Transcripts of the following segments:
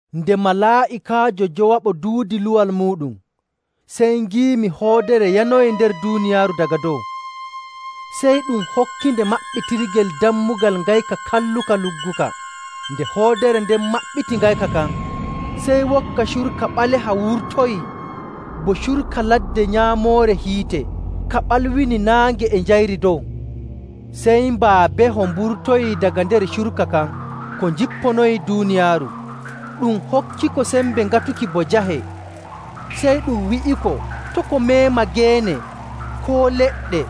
Nde malaa'ikaajo njowaɓo duudi luwal muuɗum, sey ngiimi hoodere yanoyii nder duuniyaaru daga dow. Sey ɗum hokkinde maɓɓitirgel dammugal ngayka kalluka lugguka. Nde hoodere nden maɓɓiti ngayka kan, sey wokka curka ɓaleha wurtoyii bo curka ladde nyaamoore hiite, ka ɓalwini naange e njayri dow. Sey mbaabeho mburtoyii daga nder curka kan ko njipponoyii duuniyaaru. Ɗum hokkiko sembe ŋatuki bo jahe. Sey ɗum wi'iko to' ko meema geene, koo leɗɗe,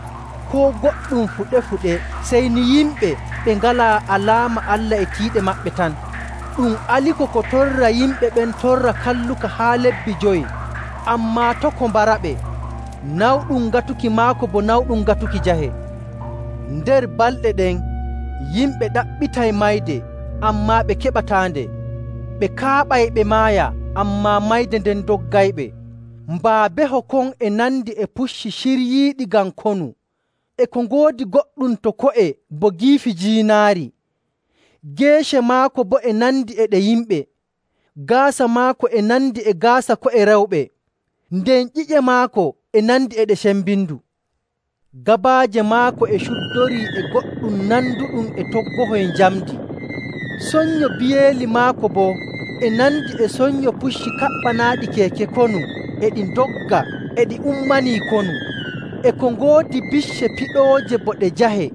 koo goɗɗum fuɗe‑fuɗe, sey ni yimɓe ɓe ngalaa alaama Allah e tiiɗe maɓɓe tan. Ɗum aliko ko torra yimɓe ɓen torra kalluka haa lebbi jowi, ammaa to' ko mbaraɓe. Nawɗum ŋatuki maako bo nawɗum ŋatuki jahe. Nder balɗe ɗen yimɓe ɗaɓɓitay mayde, ammaa ɓe keɓataande; ɓe kaaɓay ɓe maaya, ammaa mayde nden doggayɓe. Mbaabeho kon e nandi e pucci ciryiiɗi ngam konu, e ko ngoodi goɗɗum to ko'e bo giifi jiinaari, geece maako boo e nandi e ɗe yimɓe. Gaasa maako e nandi e gaasa ko'e rewɓe, nden nyiiƴe maako e nandi e ɗe sembindu. Gabaaje maako e cuddorii e goɗɗum nanduɗum e toggohoy njamndi, sonnyo biyeeli maako boo e nandi e sonnyo pucci kaɓɓanaaɗi keeke konu e ɗi ndogga e ɗi ummanii konu. E ko ngoodi bicce piɗooje bo ɗe jahe.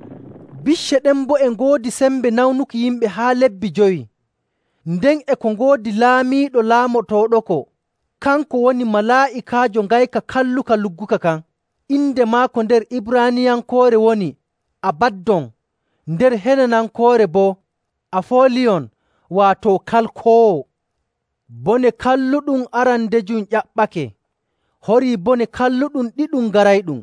Bicce ɗen boo e ngoodi sembe nawnuki yimɓe haa lebbi jowi. Nden e ko ngoodi laamiiɗo laamotooɗoko, kanko woni malaa'ikaajo ngayka kalluka lugguka kan. Inde maako nder Ibraaniyankoore woni “Abaddon,” nder Helenankoore boo “Afooliyon,” waato Kalkoowo. Bone kalluɗum arandejum ƴaɓɓake. Horii bone kalluɗum ɗiɗum garayɗum.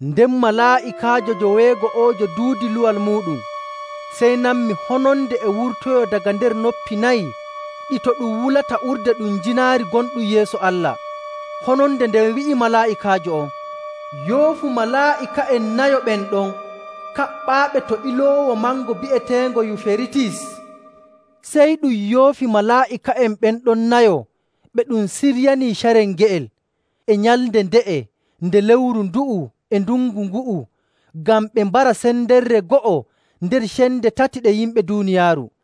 Nden malaa'ikaajo joweego'oojo duudi luwal muuɗum, sey nanmi hononde e wurtoyoo daga nder noppi nayi ɗi to ɗum wulata urde ɗum jiinaari gonɗum yeeso Allah. Hononde nden wi'i malaa'ikaajo on, “Yoofu malaa'ika'en nayo ɓen ɗon kaɓɓaaɓe to iloowo mango bi'eteengo Yuferitis!” Sey ɗum yoofi malaa'ika'en ɓen ɗon nayo ɓe ɗum siryanii carel nge'el, e nyalnde nde'e nde lewru ndu'u e ndungu ngu'u ngam ɓe mbara sendere go'o nder cende tati ɗe yimɓe duuniyaaru.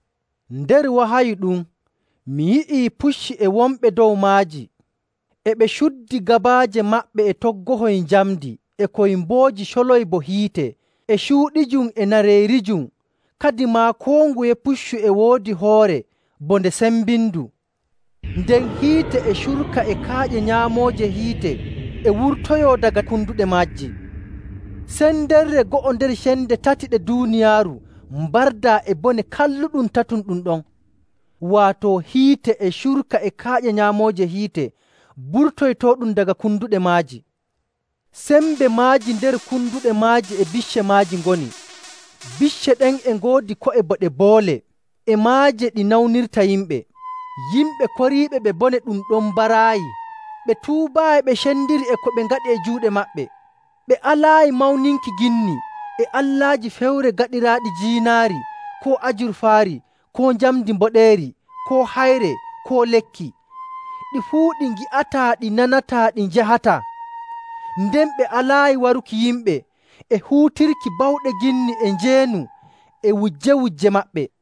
Nder wahayu ɗum mi yi'i pucci e wonɓe dow majji, e ɓe cuddi gabaaje maɓɓe e toggohoy njamndi e koy mbooji coloy bo hiite, e cuuɗijum, e nareerijum. Kadimaa koo nguye puccu e woodi hoore bo nde sembindu, nden hiite e curka e kaaƴe nyaamooje hiite e wurtoyoo daga konduɗe majji. Sendere go'o nder cende tati ɗe duuniyaaru mbardaa e bone kalluɗum tatum ɗum ɗon, waato hiite, e curka, e kaaƴe nyaamooje hiite burtoytooɗum daga konduɗe maaji. Sembe maaji nder konduɗe maaji e bicce maaji ngoni. Bicce ɗen e ngoodi ko'e bo ɗe boole, e maaje ɗi nawnirta yimɓe. Yimɓe koriiɓe ɓe bone ɗum ɗon mbaraayi, ɓe tuubaayi ɓe cendiri e ko ɓe ngaɗi e juuɗe maɓɓe. Ɓe alaayi mawninki ginni, e allaaji fewre gaɗiraaɗi jiinaari, koo ajurfaari, koo njamndi mboɗeeri, koo hayre, koo lekki. Ɗi fuu ɗi ngi'ataa, ɗi nanataa, ɗi njahataa. Nden ɓe alaayi waruki yimɓe, e huutirki bawɗe ginni, e njeenu, e wujje‑wujje maɓɓe.